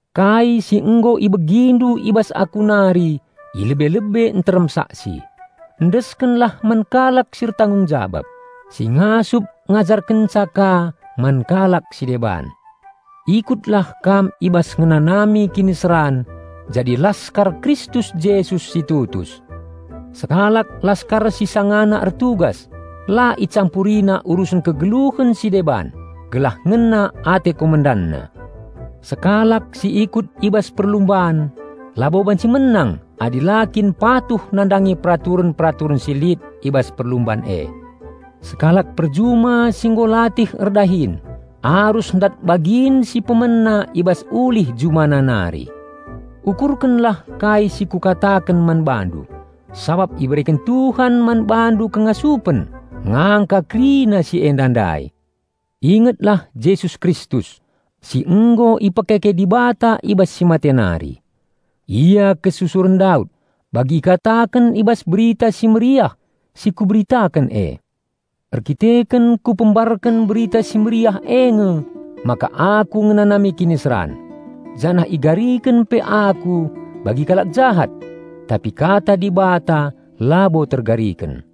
Kai si nggo ibegindu i bas aku nari i lebe-lebe nterem saksi, endeskenlah man kalak si ertanggung jabab, si ngasup ngajarkenca ka man kalak si deban. Ikutlah kam i bas ngenanami kiniseran jadi laskar Kristus Jesus si tutus. Sekalak laskar si sangana ertugas la icampurina urusen kegeluhen si deban gelah ngena ate komendanna. Sekalak si ikut i bas perlumban labo banci menang adi la kin patuh nandangi peraturen-peraturen si lit i bas perlumban e. Sekalak perjuma si nggo latih erdahin arus ndat bagin si pemena i bas ulih jumana nari. Ukurkenlah kai si kukataken man bandu, sabap ibereken Tuhan man bandu kengasupen ngangka kerina si enda ndai. Ingetlah Jesus Kristus, si nggo ipekeke Dibata i bas si mate nari. Ia kesusuren Daud, bagi ikataken i bas Berita Si Mehuli si ku beritaken e. Erdandanken kupembarken Berita Si Mehuli e nge maka aku ngenanami kiniseran, janah igariken pe aku bagi kalak jahat. Tapi kata Dibata labo tergariken,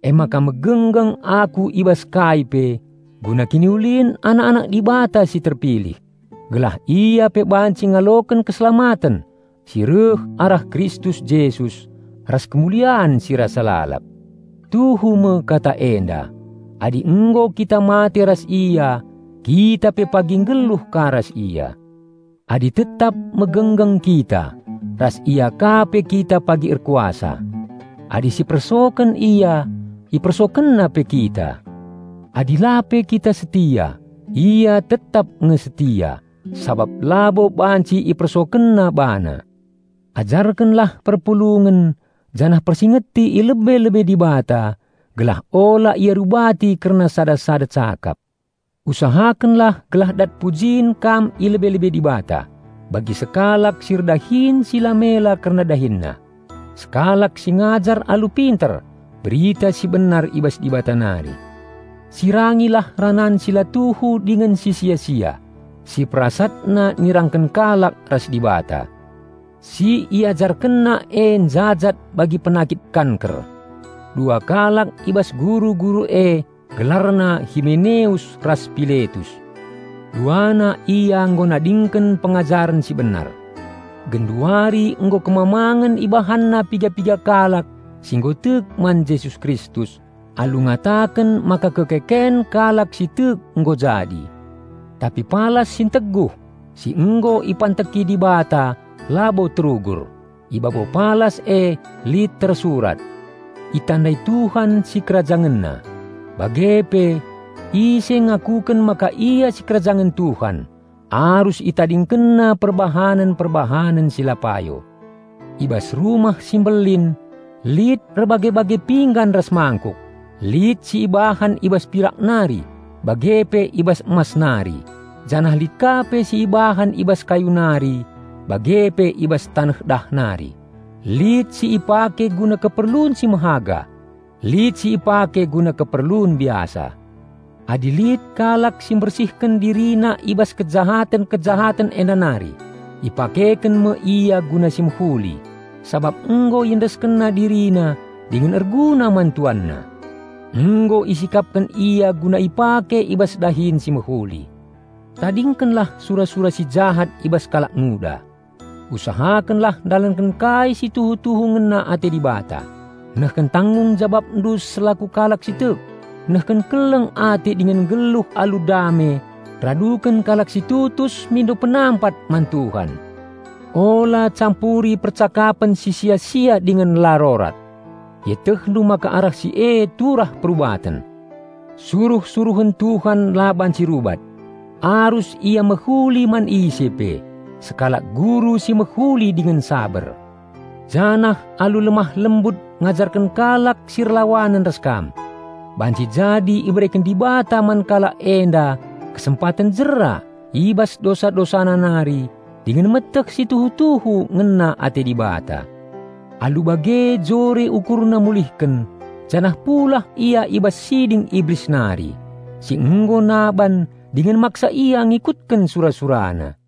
emaka megenggeng aku i bas kai pe guna kiniulin anak-anak Dibata si terpilih, gelah ia pe banci ngaloken keselamaten si reh arah Kristus Jesus, ras kemulian si rasa lalap. Tuhu me kata enda, "Adi nggo kita mate ras Ia, kita pe pagi nggeluh ka ras Ia. Adi tetap megenggeng kita, ras Ia ka pe kita pagi erkuasa. Adi si persoken Ia, IpersokenNa pe kita. Adi la pe kita setia, Ia tetap nge setia, sabap labo banci IpersokenNa bana." Ajarkenlah perpulungen janah persingeti i lebe-lebe Dibata gelah ula ia rubati kerna sada-sada cakap. Usahakenlah gelah dat pujin kam i lebe-lebe Dibata, bagi sekalak si erdahin si la mela kerna dahinna, sekalak si ngajar alu pinter berita si benar i bas Dibata nari. Sirangilah ranan si la tuhu dingen si sia-sia, si perasatna nirangken kalak ras Dibata. Si iajarkenna e njajat bagi penakit kanker. Dua kalak i bas guru-guru e gelarna Himeneus ras Piletus. Duana ia nggo nadingken pengajaren si benar. Genduari nggo kemamangen ibahanna piga-piga kalak si nggo tek man Jesus Kristus alu ngataken maka kekeken kalak si tek nggo jadi. Tapi palas si nteguh si nggo ipanteki Dibata labo terugur. I babo palas e lit tersurat, "Itandai Tuhan SikerajangenNa," bage pe, "Ise ngakuken maka ia sikerajangen Tuhan arus ItadingkenNa perbahanen-perbahanen si la payo." I bas rumah si mbelin lit erbage-bage pinggan ras mangkuk, lit si ibahan i bas pirak nari bage pe i bas emas nari janah lit ka pe si ibahan i bas kayu nari bage pe i bas taneh dah nari; lit si ipake guna keperlun si mehaga, lit si ipake guna keperlun biasa. Adi lit kalak si mbersihken dirina i bas kejahaten-kejahaten enda nari, ipakeken me ia guna si mehuli, sabap nggo iendeskenna dirina dingen erguna man tuanna. Nggo isikapken ia guna ipake i bas dahin si mehuli. Tadingkenlah sura-sura si jahat i bas kalak nguda. Usahakenlah ndalanken kai si tuhu-tuhu ngena ate Dibata, nehken tanggung jababndu selaku kalak si tek, nehken keleng ate dingen nggeluh alu dame raduken kalak si tutus mindo penampat man Tuhan. Ula campuri percakapen si sia-sia dingen la rorat. Ietehndu maka arah si e turah perubaten. Suruh-suruhen Tuhan la banci rubat. Arus ia mehuli man ise pe, sekalak guru si mehuli dingen saber, janah alu lemah-lembut ngajarken kalak si erlawanen ras kam. Banci jadi ibereken Dibata man kalak enda kesempaten jera i bas dosa-dosana nari dingen meteh si tuhu-tuhu ngena ate Dibata. Alu bage jore ukurna mulihken janah pulah ia i bas siding Iblis nari, si nggo naban dingen maksa ia ngikutken sura-surana.